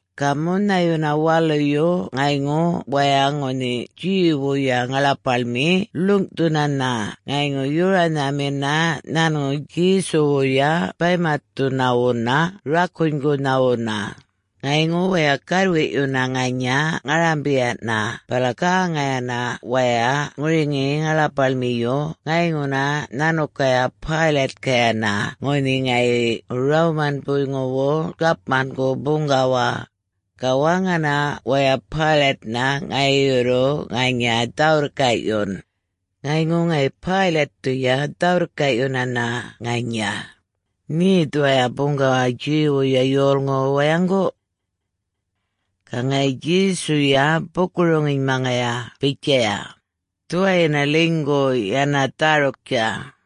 Ga munhayuna waluyu ŋayŋu waya ŋunhi Jew-wuya ŋaḻapaḻmi ḻuŋꞌthunana ŋayŋu yoranhamina nhanŋu Djesuwuya baymatthunawuna rakunygunhawuna. Ŋayŋu waya gärrwiꞌyuna ŋanya ŋarambiyana bala gäŋayana waya ŋuriŋi ŋaḻapaḻmiyu ŋayŋuna nhanukaya Pilate-kayana ŋunhi ŋayi Roman-buyŋuwu gapmangu buŋgawa. Ga waŋana waya Pilate-na ŋayi yurru ŋanya dhä-wirrkaꞌyun. Ŋayŋu ŋayi Pilate-thuya dhä-wirrkaꞌyunana ŋanya, “Nhe dhuwaya buŋgawa Jew-wuya yolŋuwu wayaŋgu?” Ga ŋayi Djesuya buku-roŋinymaŋaya bitjaya, “Dhuwayina ḻinygu yana dhäruktja.”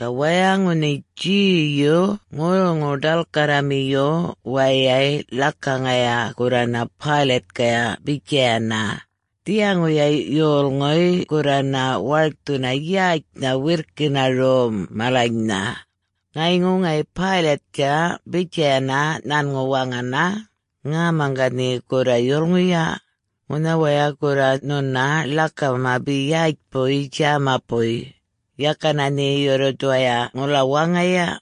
Ga waya ŋunhi Jewyu ŋurruŋu-ḏalkarramiyu wayay ḻakaŋaya gurrana Pilate-kaya bitjayana, “Dhiyaŋuya yolŋuy gurrana warkthuna yätjnha wirrkina rom malanynha.” Ŋayŋu ŋayi Pilate-tja bitjayana nhanŋu waŋana, “Ŋäma ga nhe gurra yulŋuya? Ŋunha waya gurra nhuna ḻakama be yätjpuy djämapuy. Yakana nhe yurru dhuwaya ŋula waŋaya?”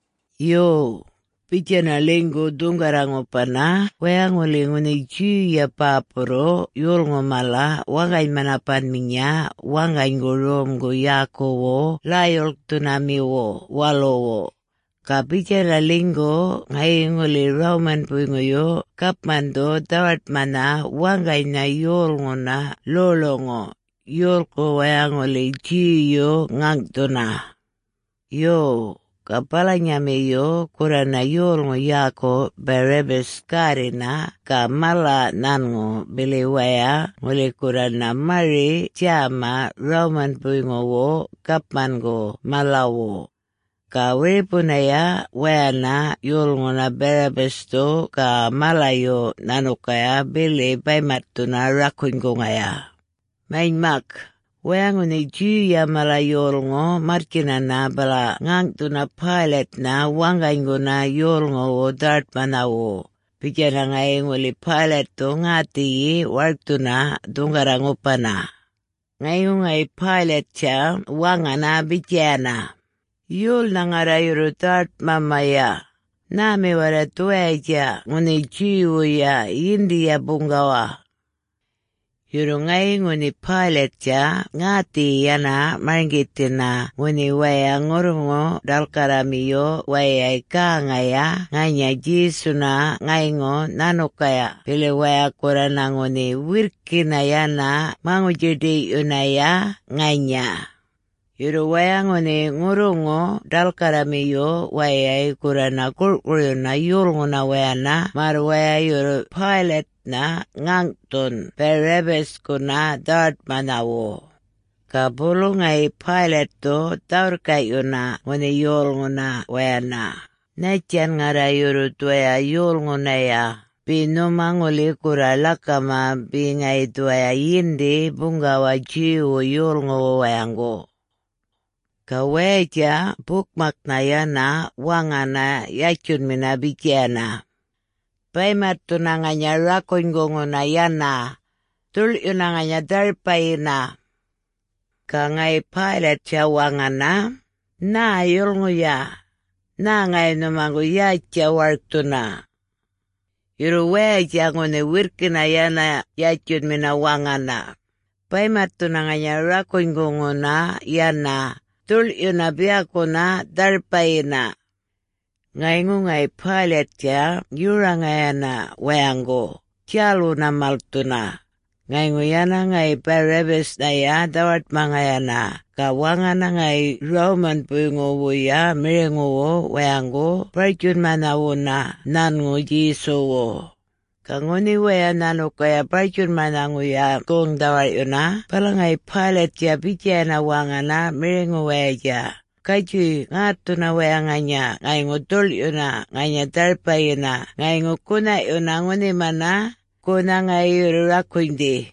Yo, bitjana ḻinygu dhuŋgarra-ŋupana waya ŋuli ŋunhi Jew-ya bäpurruꞌ yolŋu mala waŋgany-manapanminya waŋganygu romgu yäkuwu Ḻäy-djuḻkthunamiwu Waluwu. Ga bitjana ḻinygu ŋayi ŋuli Roman-buyŋuyu gapmandhu dhawaṯmanha waŋganynha yolŋuna ḻoḻuŋu, yolku waya ŋuli Jew-yu ŋäŋꞌthuna. Yo, ga balanyamiyu gurrana yolŋu yäku Barabbas gärrina ga mala nhanŋu bili waya ŋuli gurrana mari-djäma Roman-buyŋuwu gapmangu malawu. Ga wiripunaya wayana yolŋuna Barabbas-thu ga malayu nhanukaya bili baymatthuna rakunyguŋaya. Manymak, waya ŋunhi Jew-ya mala yolŋu marrtjinana bala ŋäŋꞌthuna Pilate-na waŋganyguna yolŋuwu dhawaṯmanhawu, bitjana ŋayi ŋuli Pilate-thu ŋäthiyi warkthuna dhuŋgarra-ŋupana. Ŋayŋu ŋayi Pilate-tja waŋana bitjayana, “Yolnha ŋarra yurru dhawaṯmamaya? Nhämi warray dhuwayatja ŋunhi Jew-wuya yindiya buŋgawa?” Yurru ŋayi ŋunhi Pilate-tja ŋäthiyi yana marŋgithina ŋunhi waya ŋurruŋu-ḏalkarramiyu wayay gäŋaya ŋanya Djesuna ŋayŋu nhanukaya bili waya gurrana ŋunhi wirrkina yana maŋutji-ḏiyꞌyunaya ŋanya. Yurru waya ŋunhi ŋurruŋu-ḏalkarramiyu wayay gurrana gurꞌkuryuna yolŋuna wayana märr waya yurru Pilate-na ŋäŋꞌthun Barabbas-kuna dhawaṯmanhawu. Ga bulu ŋayi Pilate-thu dhä-wirrkaꞌyuna ŋunhi yolŋuna wayana, “Nhattjan ŋarra yurru dhuwaya yolŋunaya, be nhuma ŋuli gurra ḻakama be ŋayi dhuwaya yindi buŋgawa Jew-wu yolŋuwu wayaŋgu?” Ga wayatja bukmaknha yana waŋana yatjunmina bitjayana, “Baymatthuna ŋanya rakunyguŋuna yana! Dhuḻꞌyuna ŋanya dharpayina!” Ga ŋayi Pilate-tja waŋana, “Nhä yulŋuya? Nhä ŋayi nhumaŋgu yätjtja warkthuna?” Yurru wayatja ŋunhi wirrkina yana yatjunmina waŋana, “Baymatthuna ŋanya rakunyguŋuna yana, dhuḻꞌyuna biyakuna dharpayina!” Ŋayŋu ŋayi Pilate-tja yoraŋayana wayaŋgu, djälwuna malthuna. Ŋayŋu yana ŋayi Barabbas-nhaya dhawaṯmaŋayana. Ga waŋana ŋayi Roman-buyŋuwuya miriŋuwu wayaŋgu bartjunmanhawuna nhanŋu Djesuwu. Ga ŋunhi waya nhanukaya bartjunmanhaŋuya goŋ-dhawarꞌyuna bala ŋayi Pilate-tja bitjayana waŋana miriŋuwayatja, “Gatjuy ŋätthuna waya ŋanya ŋayŋu dhuḻꞌyuna ŋanya dharpayina ŋayŋu gunhaꞌyuna ŋunhimana, gunha ŋayi yurru rakunydhi.”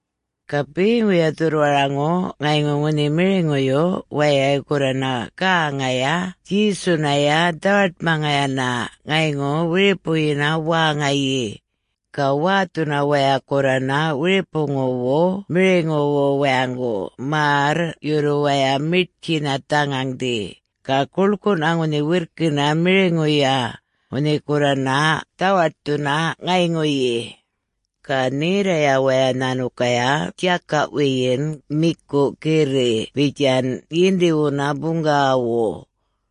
Ga beŋuya dhurrwaraŋu ŋayŋu ŋunhi miriŋuyu wayay gurrana gäŋaya Djesunaya dhawaṯmaŋayana ŋayŋu wiripuyina wäŋayi. Ga wäthuna waya gurrana wiripuŋuwu miriŋuwu wayaŋgu märr yurru waya miṯtjina dhaŋaŋꞌdhi, ga guḻkuꞌna ŋunhi wirrkina miriŋuya, ŋunhi gurrana dhawaṯthuna ŋayŋuyi. Ga nhirraya waya nhanukaya djakaꞌ wiyin miku girriꞌ bitjan yindiwuna buŋgawawu.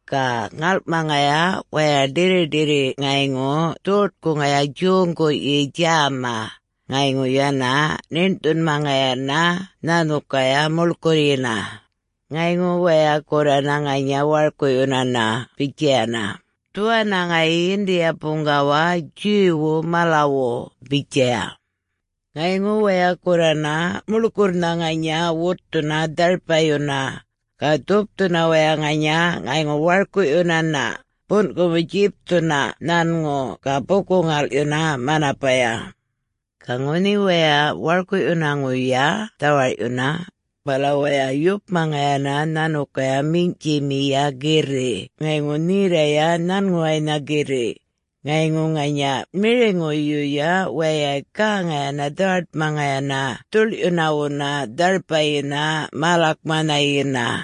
Ga ŋalꞌmaŋaya waya ḏirriṯirri ŋayŋu dhoṯkuŋaya, djoŋguꞌyi djäma, ŋayŋu yana ṉiṉꞌthunmaŋayana nhanukaya muḻkurryina. Ŋayŋu waya gurrana ŋanya warkuꞌyunana bitjayana, “Dhuwana ŋayi yindiya buŋgawa Jew-wu malawu!” bitjaya. Ŋayŋu waya gurrana muḻkurrnha ŋanya wutthuna dharpayuna, ga dhupthuna waya ŋanya ŋayŋu warkuꞌyunana, bunꞌkumu-djipthuna nhanŋu ga buku-ŋalꞌyuna manapaya. Ga ŋunhi waya warkuꞌyunaŋuya dhawarꞌyuna, bala waya yupmaŋayana nhanukaya minyꞌtjimiya girriꞌ ŋayŋu nherraꞌya nhanŋuwaynha girriꞌ. Ŋayŋu ŋanya miriŋuyuya wayay gäŋayana dhawaṯmaŋayana dhuḻꞌyunawuna dharpayina mälakmanhayina.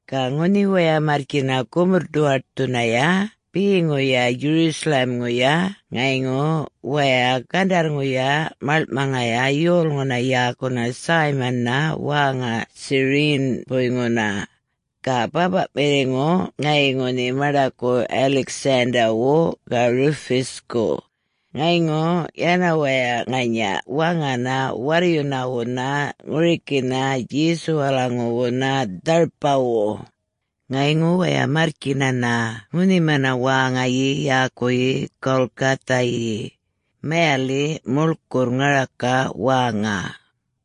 Ga ŋunhi waya marrtjina gumurr-ḏuwaṯthunaya beŋuya Jerusalem-ŋuya ŋayŋu waya gandarrŋuya maḻŋꞌmaŋaya yolŋuna yäkuna Simon-na wäŋa Cyrene-buyŋuna. Ga bäpaꞌmiŋu ŋayi ŋunhi maṉḏaku Alexander-wu ga Rufus-ku. Ŋayŋu yana waya ŋanya waŋana warryunawuna ŋurikina Djesuwalaŋuwuna dharpawu. Ŋayŋu waya marrtjinana ŋunhimana wäŋayi yäkuyi Golgotha-yi, mayaliꞌ, ‘Muḻkurr Ŋaraka Wäŋa.’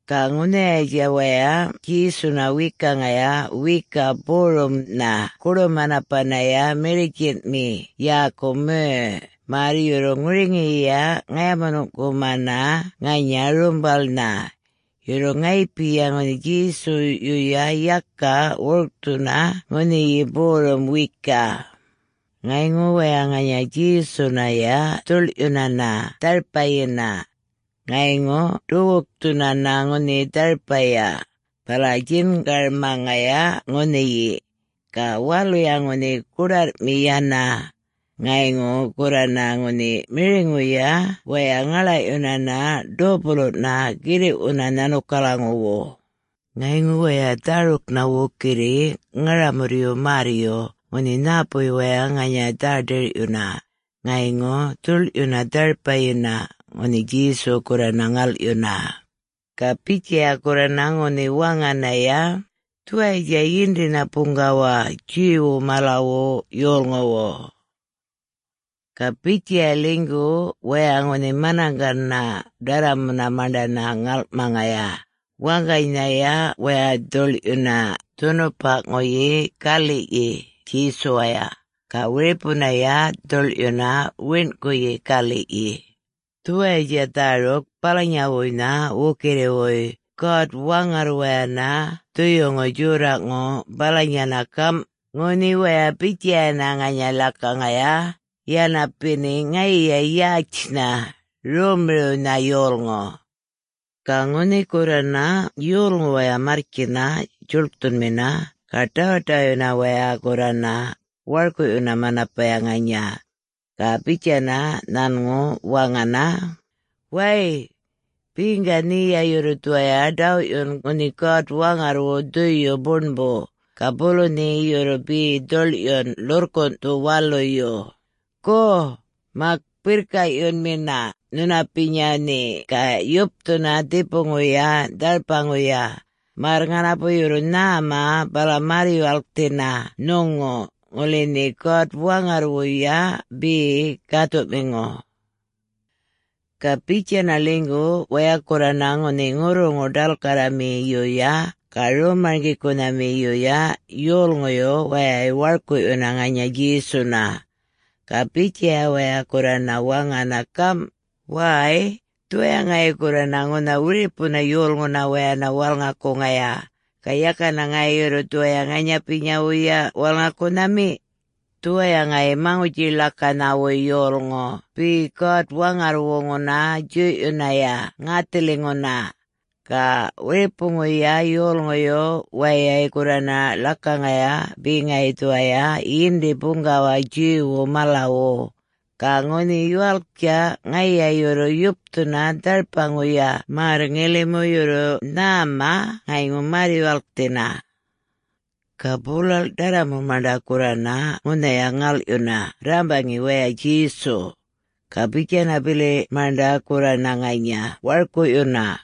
Ga ŋunhayatja waya Djesuna wekaŋaya wiyikaꞌ borumnha goḏu-manapanaya mirritjinmiꞌ yäku merr, märr yurru ŋuriŋiya ŋayamunuŋꞌkumana ŋanya rumbalnha. Yurru ŋayipiya ŋunhi Djesuyuya yaka wurkthuna ŋunhi borum wiyikaꞌ. Ŋayŋu waya ŋanya Djesunaya dhuḻꞌyunana dharpayina. Ŋayŋu ḏuwukthunana ŋunhi dharpaya, bala djingarmaŋaya ŋunhiyi. Ga waluya ŋunhi goḏarrꞌmi yana. Ŋayŋu gurrana ŋunhi miriŋuya waya ŋaḻaꞌyunana dopuluꞌna girriꞌwuna nhanukalaŋuwu. Ŋayŋu waya dhäruknha wukirri ŋaramurryu märryu ŋunhi nhäpuy waya ŋanya dhä-ḏirꞌyuna, ŋayŋu dhuḻꞌyuna dharpayina, ŋunhi Djesu gurrana ŋalꞌyuna. Ga bitjaya gurrana ŋunhi waŋanaya: “Dhuwayatja Yindina Buŋgawa Jew-wu malawu yolŋuwu” Ga bitjaya ḻinygu waya ŋunhi manaŋgana ḏarramuna maṉḏana ŋalꞌmaŋaya, waŋganynhaya waya dhuḻꞌyuna dhunupaꞌŋuyi galiꞌyi Djesuwaya, ga wiripunaya dhuḻꞌyuna wiṉꞌkuyi galiꞌyi. [Dhuwayatja dhäruk balanyawuynha wukirriwuy God-Waŋarrwayana Dhuyuŋu Djorraꞌŋu balanyanha gamꞌ, “Ŋunhi waya bitjayana ŋanya ḻakaŋaya, yana beni ŋayiya yätjnha, rommiriwnha yolŋu.”] Ga ŋunhi gurrana yolŋu waya marrtjina djuḻkthunmina, ga ḏawaḏawaꞌyuna waya gurrana, warkuꞌyuna manapaya ŋanya. Ga bitjana nhanŋu waŋana, “Wäy, beŋga nheya yurru dhuwaya ḏawꞌyun ŋunhi God-Waŋarrwu Dhuyu Buṉbu, ga bulu nhe yurru be dhuḻꞌyun ḻurrkunꞌthu waluyu? Go, mak birrkaꞌyunmina nhunapinya nhe ga yupthuna dhipuŋuya dharpaŋuya, märr ŋanapu yurru nhäma bala märr-yuwalkthina nhuŋu, ŋuli nhe God-Waŋarrwuya be gäthuꞌmiŋu?” Ga bitjana ḻinygu waya gurrana ŋunhi ŋurruŋu-ḏalkarramiyuya ga rom-marŋgikunhamiyuya yolŋuyu wayay warkuꞌyuna ŋanya Djesuna. Ga bitjaya waya gurrana waŋana gamꞌ, “Way, dhuwaya ŋayi gurrana ŋunha wiripuna yolŋuna wayana walŋakuŋaya... ga yakana ŋayi yurru dhuwaya ŋanyapinyawuya walŋakunhami? Dhuwaya ŋayi ‘Maŋutji-ḻakanhawuy yolŋu’ be God-Waŋarrwuŋuna djuyꞌyunaya ŋäthiliŋuna. Ga wiripuŋuya yolŋuyu wayay gurrana ḻakaŋaya be ŋayi dhuwaya Yindi Buŋgawa Jew-wu malawu. Ga ŋunhi yuwalktja, ŋayiya yurru yupthuna dharpaŋuya märr ŋilimu yurru nhäma ŋayŋu märr-yuwalkthina.” Ga bulalꞌ ḏarramu maṉḏa gurrana ŋunhaya ŋalꞌyuna rrambaŋi waya Djesu. Ga bitjana bili maṉḏa gurrana ŋanya warkuꞌyuna.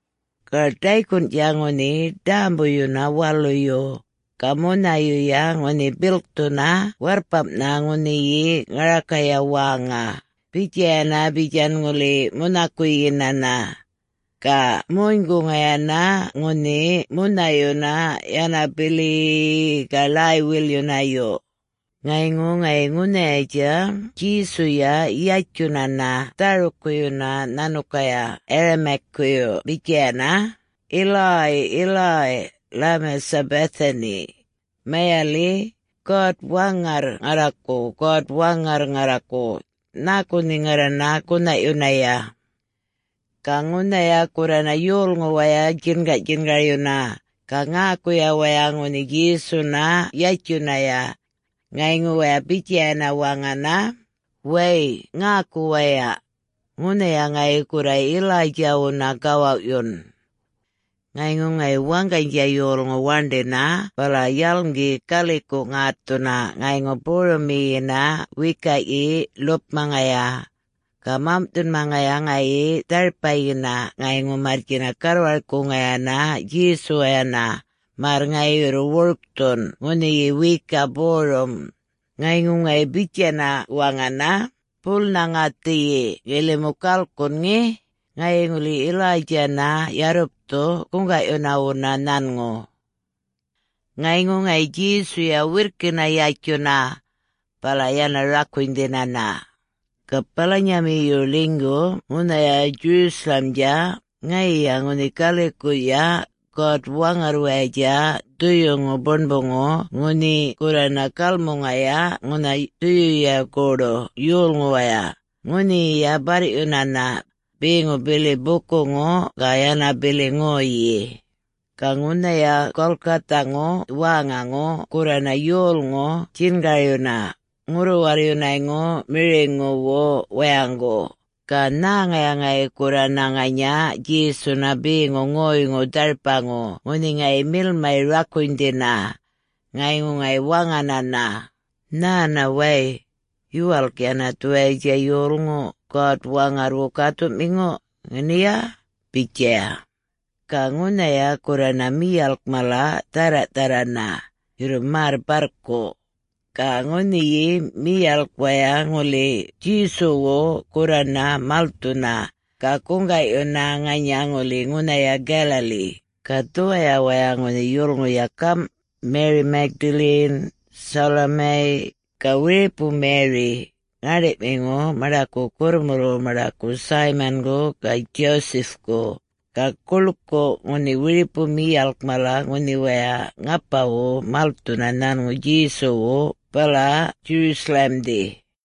Ga ḏaykunꞌtja ŋunhi ḏämbuyuna waluyu, ga munhayuya ŋunhi bilkthuna warrpamꞌnha ŋunhiyi ŋarakaya wäŋa, bitjayana bitjan ŋuli munhakuyinana. Ga munyguŋayana ŋunhi munhayuna yana bili-i-i ga ḻäy-wilyunayu. Ŋayŋu ŋayi ŋunhayatja Djesuya yatjunana dhärukuyuna nhanukaya Aramaic-kuyu bitjayana, “Eloi, Eloi, lema sabachthani?” (mayaliꞌ, “God-Waŋarr ŋarraku, God-Waŋarr ŋarraku, nhäku nhe ŋarrana gunhaꞌyunaya?”) Ga ŋunhaya gurrana yolŋu waya djingaꞌdjingaryuna, ga ŋäkuya waya ŋunhi Djesuna yatjunaya. Ŋayŋu waya bitjayana waŋana, “Way ŋäku waya! Ŋunhaya ŋayi gurra Elijah-wuna gawawꞌyun.” Ŋayŋu ŋayi waŋganydja yolŋu waṉḏina bala yalŋgi galikuꞌ ŋätthuna ŋayŋu borumiyina wiyikaꞌyi ḻupmaŋaya. Ga mamꞌthunmaŋaya ŋayi dharpayina ŋayŋu marrtjina garrwarkuŋayana Djesuwayana, märr ŋayi yurru wurkthun ŋunhiyi wiyikaꞌ borum. Ŋayŋu ŋayi bitjana waŋana, “Bulnha ŋäthiyi ŋilimu galkun ŋe!, ŋayi ŋuli Elijah-na yarrupthu guŋgaꞌyunawuna nhanŋu.” Ŋayŋu ŋayi Djesuya wirrkina yatjuna, bala yana rakunydhinana. Ga balanyamiyu ḻinygu ŋunhaya Jerusalem-dja ŋayiya ŋunhi galikuꞌya God-Waŋarrwayatja Dhuyuŋu Buṉbuŋu ŋunhi gurrana galmuŋaya ŋunha dhuyuya goḏu yolŋuwaya, ŋunhiyiya barrꞌyunana, beŋu bili bukuŋu ga yana bili ŋoyyi. Ga ŋunhaya Golgotha-ŋu wäŋaŋu gurrana yolŋu djingaryuna, ŋurru-warryunayŋu miriŋuwu wayaŋgu, ga nhäŋaya ŋayi gurrana ŋanya Djesuna beŋu ŋoyŋu dharpaŋu ŋunhi ŋayi milmay rakunydhina. Ŋayŋu ŋayi waŋanana, “Nhäna way! Yuwalk yana dhuwayatja yolŋu God-Waŋarrwu Gäthuꞌmiŋu, ŋeniya?” bitjaya. Ga ŋunhaya gurrana miyalk mala dhärraꞌdharrana, yurru märr barrku. Ga ŋunhiyi miyalk waya ŋuli Djesuwu gurrana malthuna, ga guŋgaꞌyuna ŋanya ŋuli ŋunhaya Galilee. Ga dhuwaya waya ŋunhi yulŋuya gamꞌ: Mary Magdalene, Salome, ga wiripu Mary, ŋäṉḏiꞌmiŋu maṉḏaku gurrmulwu maṉḏaku Simon-gu ga Joseph-ku, ga guḻkuꞌ ŋunhi wiripu miyalk mala ŋunhi waya ŋapawu malthuna nhanŋu Djesuwu bala Jerusalem-dhi.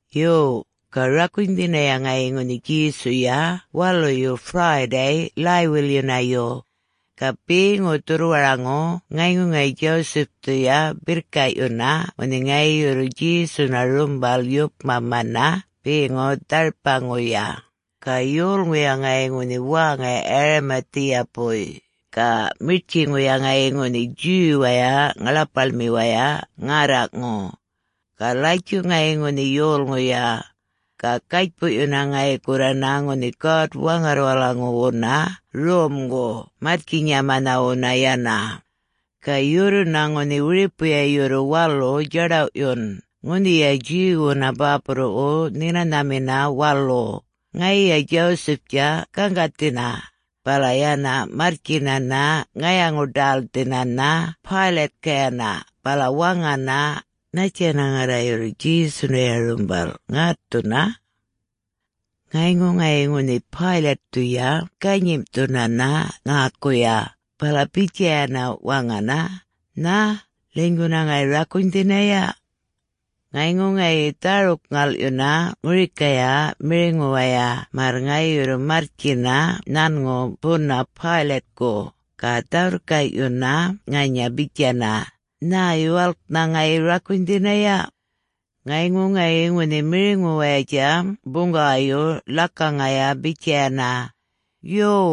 Yo, ga rakunydhinaya ŋayi ŋunhi Djesuya waluyu Friday läy-wilyunayu. Ga beŋu dhurrwaraŋu ŋayŋu ŋayi Joseph-thuya birrkaꞌyuna ŋunhi ŋayi yurru Djesuna rumbal yupmamana beŋu dharpaŋuya. Ga yolŋuya ŋayi ŋunhi wäŋa Arimathea-buy, ga miṯtjiŋuya ŋayi ŋunhi Jew-waya ŋaḻapaḻmiwaya ŋärraꞌŋu. Ga latjuꞌ ŋayi ŋunhi yolŋuya. Ga gatjpuꞌyuna ŋayi gurrana ŋunhi God-Waŋarrwalaŋuwuna romgu marrtjinyamanhawuna yana. Ga yurruna ŋunhi wiripuya yurru walu djaḏawꞌyun ŋunhiya Jew-wuna bäpurruꞌwu Nhinanamina Walu, ŋayiya Joseph-tja gaŋgathina, bala yana marrtjinana ŋayaŋu-ḏälthinana Pilate-kayana bala waŋana, “Nhattjana ŋarra yurru Djesunaya rumbal ŋätthuna?” Ŋayŋu ŋayi ŋunhi Pilate-thuya ganyimꞌthunana ŋäkuya, bala bitjayana waŋana, “Nhä, ḻinyguna ŋayi rakunydhinaya?” Ŋayŋu ŋayi dhäruk-ŋalꞌyuna ŋurikaya miriŋuwaya märr ŋayi yurru marrtjina nhanŋu buna Pilate-ku, ga dhä-wirrkaꞌyuna ŋanya bitjana, “Nhä, yuwalknha ŋayi rakunydhinaya?” Ŋayŋu ŋayi ŋunhi miriŋuwayatja buŋgawayu ḻakaŋaya bitjayana, “Yuw,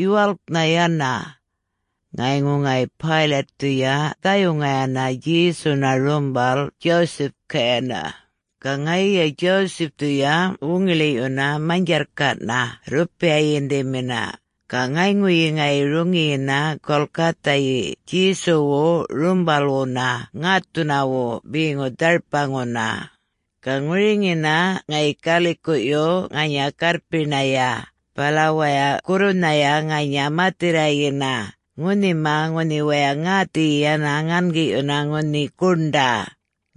yuwalknha yana!” Ŋayŋu ŋayi Pilate-thuya dhayuŋayana Djesuna rumbal Joseph-kayana. Ga ŋayiya Joseph-thuya wuŋiḻiꞌyuna manydjarrkaꞌna rrupiya yindimina, ga ŋayŋuyi ŋayi roŋiyina Golgotha-yi Djesuwu rumbalwuna ŋätthunawu beŋu dharpaŋuna. Ga ŋuriŋina ŋayi galikuꞌyu ŋanya garrpiṉaya, bala waya gurrunhaya ŋanya mathirrayina, ŋunhima ŋunhi waya ŋäthiyi yana ŋangiꞌyuna ŋunhi guṉḏa.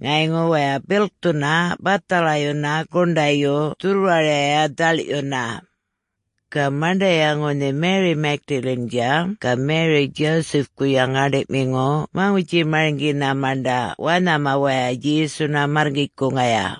Ŋayŋu waya bilkthuna bathalayuna guṉḏayu dhurrwaraya dhaḻꞌyuna. Ga maṉḏaya ŋunhi Mary Magdalene-dja ga Mary Joseph-kuya ŋäṉḏiꞌmiŋu maŋutji-marŋgina maṉḏa wanhama waya Djesuna märrkitjkuŋaya.